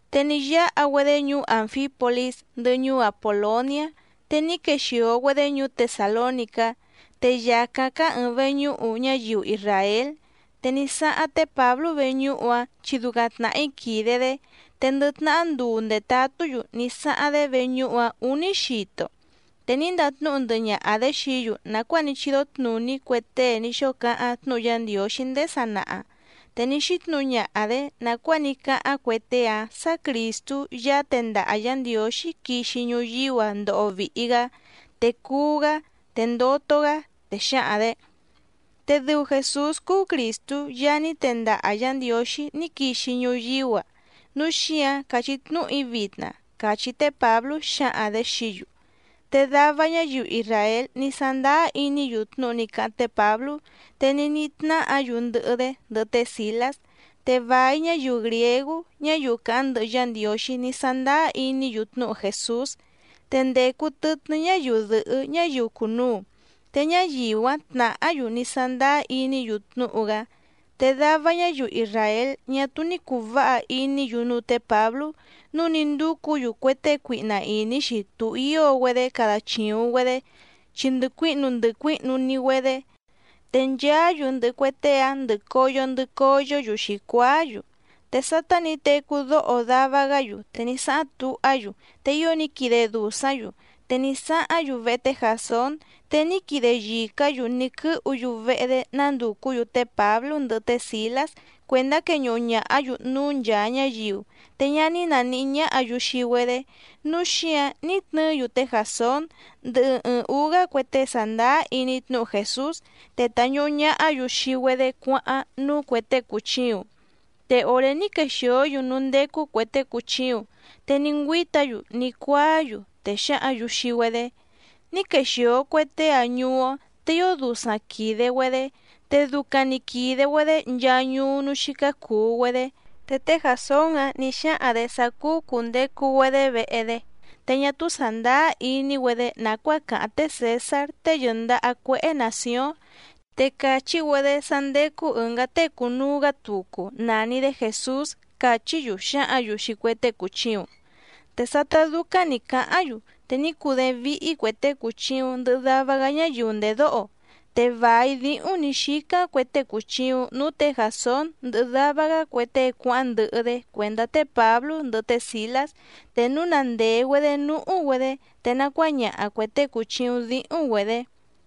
Te ní yáha‑güedé ñuú Ànfípolís ndɨhɨ ñuú Apòloniá, te ní quexìo‑güedé ñuú Tesàlónicá, te yàcáⁿ cáá ɨ̀ɨⁿ veñúhu ñáyiu isràél. Te ní sáháⁿ té Pǎblú veñúhu‑áⁿ, chi ducaⁿ tnàhí quìde‑dé, te ndɨ tnahá nduu ndètatú‑yu ní sáháⁿ‑dé veñúhu‑áⁿ ǔní xito. Te ní ndatnúhu ndɨhɨ ñaha‑dě xií‑yu nàcuáa ní chídó tnùní cue tée ní xóo cáháⁿ tnúhu Yá Ndiǒxí ndéé sanaha. Te ní xítnǔhu ñaha‑dě nàcuáa ní cáháⁿ cue tée‑áⁿ sǎ Crìstú Yaá tendaha Yǎ Ndiǒxí quixi ñuyíú‑a ndoho vìhi‑gá, te cuú‑gá, te ndoto‑gá, te xǎhaⁿ‑dě: —Te dɨu Jèsús cúú Crìstú Yaá ní tendaha Yǎ Ndiǒxí ní quixi ñuyíú‑a, núu xíǎⁿ càchí tnúhu‑í vitna —càchí té Pǎblú xǎhaⁿ‑dě xií‑yu. Te dava ñáyiu isràél ní sándáá iní‑yu tnúhu ní cáháⁿ té Pǎblú, te ní níhí tnáhǎ‑yu ndɨhɨ‑dé, ndɨhɨ té Sìlás. Te vài ñáyiu grìégú ñáyiu càháⁿ ndɨhɨ Yá Ndiǒxí ní sándáá iní‑yu tnúhu Jèsús. Te ndècu tɨtnɨ́ ñáyiu dɨ̀hɨ́ ñáyiu cùnuu, te ñáyiu‑áⁿ tnàhá‑yu ní sándáá iní‑yu tnúhu‑gá. Te dava ñáyiu isràél ñá túú ní cùu váha iní‑yu núú tě Pǎblú nǔu ní ndúcǔ‑yu cue tée cuihna ìní‑xi tuhío‑güedé cada chìuⁿ‑güedé, chi ndɨ cuíhnu ndɨ cuíhnu‑ni‑güedé, te nchaá‑yu ndɨhɨ cue tée‑áⁿ ndɨ̀ coyo ndɨ coyó‑yu xǐcuáá‑yu. Te sátá nǐ tecú dóho dava‑gá‑yu, te ní sáháⁿ tuhá‑yu, te ío ní quide dùsáⁿ‑yu. Te nísáháⁿ‑yu vehe té Jàsón, te ní quide yìcá‑yu ní quɨ́hu‑yu vehe‑dé nándùcú‑yu té Pǎblú ndɨhɨ té Sìlás cuèndá queñuhu ñàhá‑yu núú nchàa ñáyiu. Te ñá ní nàníhí ñáhǎ‑yu xii‑güedé, núu xíǎⁿ ní tnɨɨ́‑yu té Jàsón ndɨhɨ ɨɨⁿ ǔú‑gá cue tée sàndáá iní tnúhu Jèsús, te tàñuhu ñahá‑yu xii‑güedé cuáháⁿ núú cuè tée cùchiuⁿ. Te òré ní quexìó‑yu núú ndécú cuè tée cùchiuⁿ, te ní ngüíta‑yu ní cuáá‑yu, te xǎhǎⁿ‑yu xii‑güedé: —Ní quexìo cue tée‑ǎⁿ ñuú‑ó, te ío dusaⁿ quìde‑güedé, te ducaⁿ‑ni quìde‑güedé nchaa ñuú núú xícá cùu‑güedé. Te té Jàsón‑ǎⁿ ní xáhaⁿ‑dě sá cúú cùndecu‑güedé vehe‑dé, te ñá túú sàndáá iní‑güedé nàcuáa càháⁿ té Cèsár tée yɨ̀ndaha cuéhé nàcióⁿ, te càchí‑güedé sá ndécú ɨ̀ngá tée cùnuu‑gá tucu nàni‑dé Jèsús —càchí‑yu xǎhǎⁿ‑yu xii cue tée cùchiuⁿ. Te sátá dúcáⁿ nǐ cáháⁿ‑yu, te ní cudééⁿ víhí cuè tée cùchiuⁿ ndɨhɨ dava‑gá ñáyiu ndèdóho. Te vài díhúⁿ nǐ xícáⁿ cue tée cùchiuⁿ núú tě Jàsón ndɨhɨ dava‑gá cue tée cuáháⁿ ndɨhɨ‑dé cuèndá té Pǎblú ndɨhɨ té Sìlás, te núu na ndèe‑güedé núhú‑güedé, te nacuáñaha cuè tée cùchiuⁿ díhúⁿ‑güedě.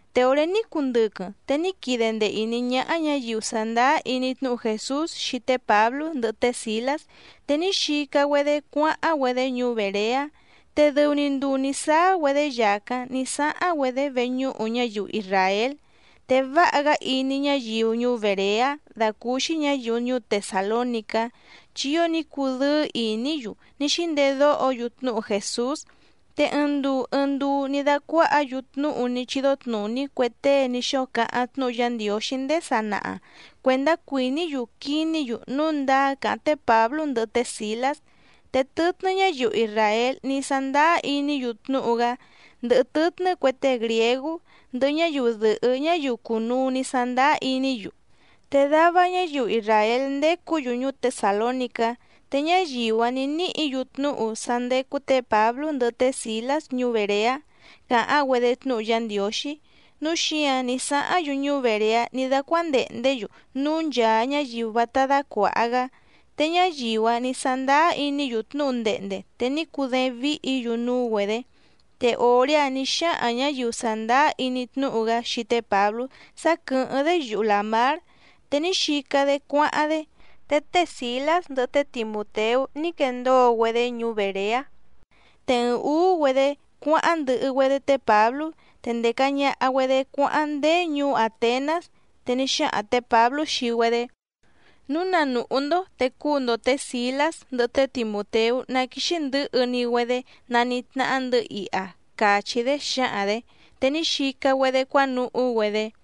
Te òré ní cundɨquɨⁿ, te ní quide ndee ìní ñáhá ñǎyiu sàndáá iní tnúhu Jèsús xii té Pǎblú ndɨhɨ té Sìlás, te ní xica‑güedé cuáháⁿ‑güedé ñuú Bèreá. Te dɨu‑ni nduu nǐ sáá‑güedé yàcáⁿ ní sáháⁿ‑güedé veñúhu ñáyiu isràél. Te váha‑gá iní ñáyiu ñuú Bèreá dàcúúxí ñǎyiu ñuú Tesàlónicá, chi ío ní cudɨ́ɨ́ ìní‑yu ní xíndedóho‑yu tnúhu Jèsús, te ɨɨⁿ nduu ɨɨⁿ nduu ní dácuáhǎ‑yu tnúhu ní chídó tnùní cue tée ní xóo cáháⁿ tnúhu Yá Ndiǒxí ndéé sanaha cuèndá cuìní‑yu quiní‑yu núu ndáá càháⁿ té Pǎblú ndɨhɨ té Sìlás. Te tɨtnɨ́ ñáyiu isràél ní sándáá iní‑yu tnúhu‑gá ndɨhɨ tɨtnɨ́ cue tée grìégú ndɨhɨ ñáyiu dɨ̀hɨ́ ñáyiu cùnuu ní sándáá iní‑yu. Te dava ñáyiu isràél ndécǔ‑yu ñuú Tesàlónicá, te ñáyiu‑áⁿ nǐ níhǐ‑yu tnúhu sá ndécú tě Pǎblú ndɨhɨ té Sìlás ñuú Bèreá càháⁿ‑güedé tnúhu Yá Ndiǒxí, núu xíǎⁿ ní sáháⁿ‑yu ñuú Bèreá ní dácuándèhndé‑yu núú nchàa ñáyiu vátá dácuàha‑gá. Te ñáyiu‑áⁿ nǐ sándáá iní‑yu tnúhu ndehnde te ní cudééⁿ víhǐ‑yu núú‑güedě. Te òré‑áⁿ nǐ xáhaⁿ ñǎyiu sàndáá iní tnúhu‑gá xii té Pǎblú sá quɨ̀hɨ́ⁿ‑dé yuhu làmár, te ní xica‑dé cuáháⁿ‑dé, te té Sìlás ndɨhɨ té Timùteú ní quendóo‑güedé ñuú Bèreá. Te ɨɨⁿ ǔú‑güedé cuáháⁿ ndɨhɨ‑güedé té Pǎblú, te ndèca ñaha‑güedé cuáháⁿ ndéé ñuú Àtenás, te ní xáhaⁿ tě Pǎblú xii‑güedé: —Núu na nùhú‑ndó, te cúu‑ndo tě Sìlás ndɨhɨ té Timùteú ná quíxí ndɨ̌hɨ‑ni‑güedé nanítnáhá‑ndɨ̌ iha —càchí‑dé xǎhaⁿ‑dě. Te ní xica‑güedé cuánuhú‑güedé.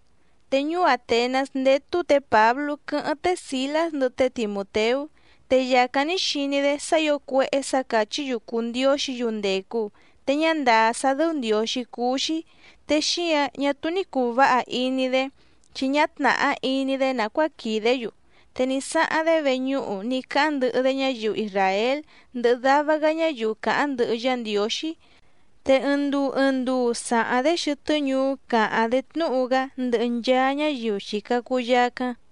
Te ñuú Àtenás ndétú tě Pǎblú quɨ́hɨ́ⁿ té Sìlás ndɨhɨ té Timùteú. Te yàcáⁿ ní xiní‑dé sá ǐo cuéhé sǎ càchí‑yu cùu ndióxǐ‑yu ndècu te ñá ndàá sá dɨ́ú ndiǒxí cúú‑xí, te xíǎⁿ ñá túú ní cùu váha iní‑dé, chi ñá tnàhá iní‑dé nàcuáa quìdé‑yu. Te ní sáháⁿ‑dé veñúhu ní cáháⁿ ndɨhɨ‑dé ñáyiu isràél ndɨhɨ dava‑gá ñáyiu càháⁿ ndɨhɨ Yá Ndiǒxí. Te ɨɨⁿ nduu ɨɨⁿ nduu sàháⁿ‑dé xɨtɨ́ ñuú càháⁿ‑dé tnúhu‑gá ndɨhɨ nchaa ñáyiu xìca cuu yacáⁿ.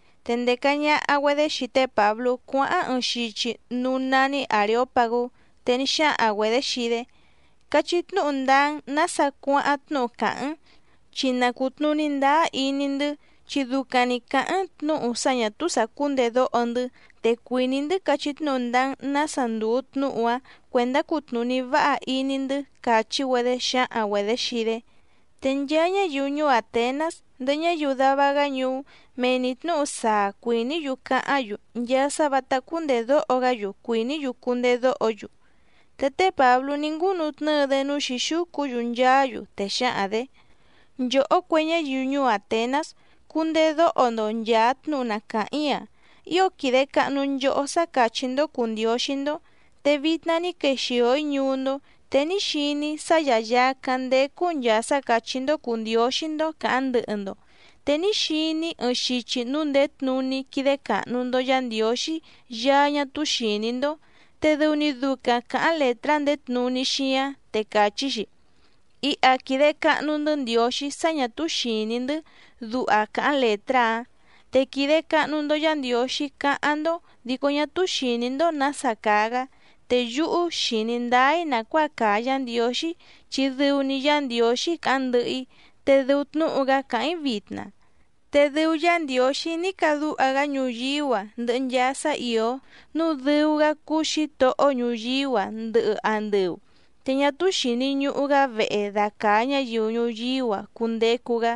Te ndèca ñaha‑güedé xii té Pǎblú cuáháⁿ ɨɨⁿ xichi núú nání Àreópagú, te ní xáhaⁿ‑güedě xii‑dé: —Cachí tnúhu ndáá‑n nǎsa cuáháⁿ tnúhu càháⁿ‑n, chi na cùtnuní ndáá iní‑ndɨ́, chi ducaⁿ‑ni càháⁿ‑n tnǔhu sá ñà túú sàcúndèdóho‑ndɨ́, te cuìní‑ndɨ́ cachí tnúhu ndáá‑n nǎsa ndùu tnúhu‑áⁿ cuèndá cutnùní váha iní‑ndɨ́ —càchí‑güedé xǎhaⁿ‑güedě xii‑dé. Te nchaa ñáyiu ñuú Àtenás ndɨhɨ ñáyiu dava‑gá ñuú, mee‑ni tnǔhu saa cuìní‑yu cáháⁿ‑yu, nchaa sá vǎtá cúndèdóho‑gá‑yu cuìní‑yu cundedóho‑yu. Te té Pǎblú ní ngúnutnɨ́ɨ‑dé núú xǐxúcu‑yu nchaá‑yu, te xǎhaⁿ‑dě: —Nchòhó cue ñáyiu ñuú Àtenás, cundedóho‑ndo nchàa tnúhu na càháⁿ‑í‑a. Ío quìde cahnu nchohó sá càchí‑ndó cùu ndióxí‑ndó. Te vitna ní quexìo‑í ñuú‑ndó, te ní xiní‑í sá yàyacáⁿ ndécú nchàa sá càchí‑ndó cùu ndióxí‑ndó càháⁿ ndɨhɨ‑ndo. Te ní xiní‑í ɨɨⁿ xichi núú ndèé tnuní quídé càhnu‑ndo Yá Ndiǒxí Yaá ñá túú xìní‑ndó, te dɨu‑ni ducaⁿ càháⁿ lètrá ndèé tnuní xíáⁿ, te càchí‑xi: “Iha quìde cahnu‑ndɨ́ Ndiǒxí sá ñà túú xìní‑ndɨ́”, duha càháⁿ lètrá‑áⁿ. Te quìde cahnu‑ndo Yá Ndiǒxí cáháⁿ‑ndó, dico ñá túú xìní‑ndó nǎsa càa‑gá, te yúhú xìní ndáá‑í nàcuáa càa Yá Ndiǒxí, chi dɨu‑ni Yá Ndiǒxí càháⁿ ndɨhɨ‑í, te dɨu tnúhu‑gá càháⁿ‑í vitna. ’Te dɨu Yá Ndiǒxí ní cadúha‑gá ñuyíú‑a ndɨhɨ nchaa sá ìó, núu dɨu‑gá cúú Xǐtohó ñuyíú‑a ndɨhɨ andɨu. Te ñá túú xìni ñuhu‑gá vehe dàcaa ñáyiu ñuyíú‑a cundecu‑gá.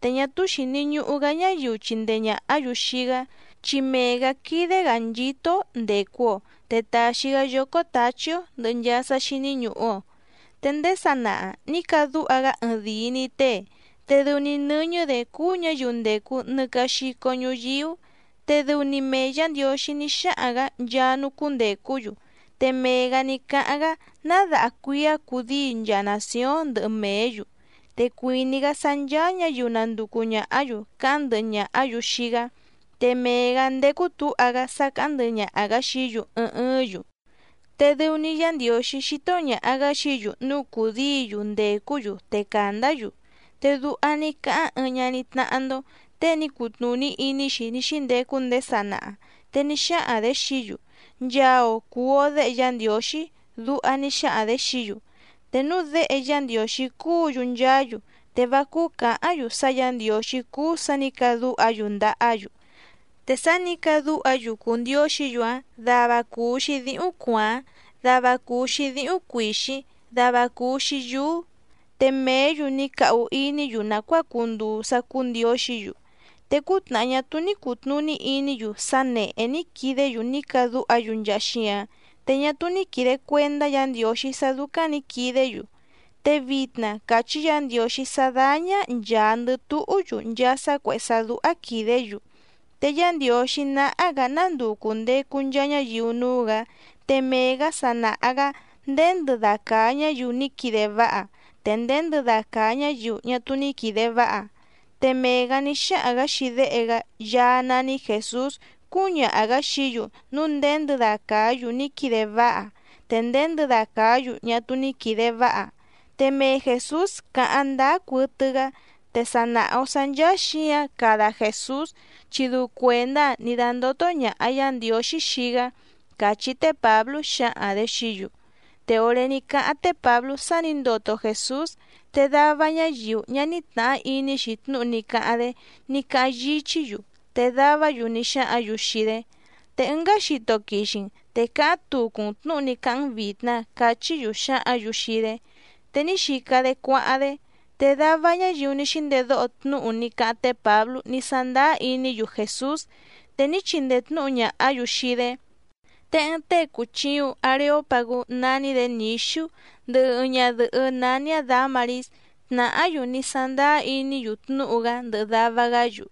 Te ñá túú xìni ñuhu‑gá ñáyiu chindee ñàhá‑yu xii‑gá, chi mee‑gǎ quídé‑gǎ nchító‑ó ndècu‑o te tàxi‑gá yócó tǎchí‑ó ndɨ̀hɨ nchaa sá xíní ñùhu‑o. ’Te ndéé sanaha nǐ cadúha‑gá ɨɨⁿdìi‑ni tée, te dɨu‑ni nɨ́ñɨ́‑dě cúú ñǎyiu ndècu nɨcaxico ñuyíú. Te dɨu‑ni mee Yǎ Ndiǒxí ní xáhaⁿ‑gǎ nchaa núú cúndècú‑yu, te mee‑gǎ ní cáháⁿ‑gá ná daha cuíá cudíi nchaa nàcióⁿ ndɨhɨ mèé‑yu. Te cuìní‑gá sá ncháá ñǎyiu nanducu ñàhá‑yu cáháⁿ ndɨhɨ ñàhá‑yu xii‑gá, te mee‑gǎ ndécú tǔha‑gá sá càháⁿ ndɨhɨ ñaha‑gǎ xií‑yu ɨɨⁿ ɨɨ́ⁿ‑yu. Te dɨu‑ni Yá Ndiǒxí xító ñàha‑gá xií‑yu núu cùdíi‑yu ndècú‑yu te càndá‑yu. Te duha ní cáháⁿ ɨɨⁿ ñaní tnáhá‑ndó, tée ní cutnùní iní‑xi ní xíndecu ndéé sanaha, te ní xáhaⁿ‑dě xií‑yu: “Nchaa‑o cùu‑o déhe Yá Ndiǒxí”, duha ní xáhaⁿ‑dě xií‑yu. Te núu déhe Yá Ndiǒxí cúǔ‑yu nchaá‑yu, te vá cúú cǎháⁿ‑yu sá Yǎ Ndiǒxí cúú sǎ nǐ cadúha‑yu ndahá‑yu. Te sá nǐ cadúha‑yu cùu ndióxǐ‑yu‑áⁿ, dava cùu‑xi díhúⁿ cuàáⁿ, dava cùu‑xi díhúⁿ cuìxíⁿ, dava cùu‑xi yúú. Te mèé‑yu ní cahu iní‑yu nàcuáa cunduu sá cúú ndiǒxǐ‑yu. Te cútnàhá ñá túú ní cùtnuní iní‑yu sá nèhé ní quidé‑yu ní cadúha‑yu nchaa xíǎⁿ, te ñá túú ní quìde cuendá Yǎ Ndiǒxí sá dúcáⁿ nǐ quidé‑yu. Te vitna càchí Yǎ Ndiǒxí sá dáñá nchàa ndɨ túhú‑yu nchaa sá cuèhé sá dúhá quìdé‑yu. Te Yá Ndiǒxí náhá‑gǎ ná nduu cùndecu nchaa ñáyiu núú‑gǎ, te mee‑gǎ sa nàha‑gá nděndɨda càa ñáyiu ní quide váha, te nděndɨda càa ñáyiu ñá túú ní quìde váha. Te mee‑gǎ ní xáhaⁿ‑gǎ xii Déhe‑gá Yaá nání Jèsús cúñaha‑gǎ xií‑yu núu nděndɨda càá‑yu ní quide váha te nděndɨda càá‑yu ñá túú ní quìde váha. Te mee Jèsús cáháⁿ ndáá cuɨtɨ‑gá, te sa nàha‑o sá ncháá xǐǎⁿ cada Jèsús, chi dɨu cuèndá‑áⁿ nǐ dándótó ñàha Yá Ndiǒxí xii‑gá —càchí té Pǎblú xǎhaⁿ‑dě xií‑yu. Te òré ní cáháⁿ té Pǎblú sá nǐ ndoto Jèsús, te dava ñáyiu ñá ní tnàhá iní‑xi tnúhu ní cáháⁿ‑dé ní cáháⁿ yíchí‑yu. Te davá‑yu ní xáhǎⁿ‑yu xii‑dé: —Te ɨngá xito quixi‑n, te cáháⁿ tucu‑n tnǔhu ní cáháⁿ‑n vìtna —cachí‑yu xǎhǎⁿ‑yu xii‑dé. Te ní xica‑dé cuáháⁿ‑dé. Te dava ñáyiu ní xíndedóho tnúhu ní cáháⁿ té Pǎblú ní sándáá iní‑yu Jèsús, te ní chindee tnǔhu ñàhá‑yu xii‑dé. Te ɨɨⁿ tée cùchiuⁿ Areópagú nání‑dě Nǐxú ndɨhɨ ɨɨⁿ ñadɨ̀hɨ́ nání‑áⁿ Dǎmarís, tnàhá‑yu ní sándáá iní‑yu tnúhu‑gá ndɨhɨ dava‑gá‑yu.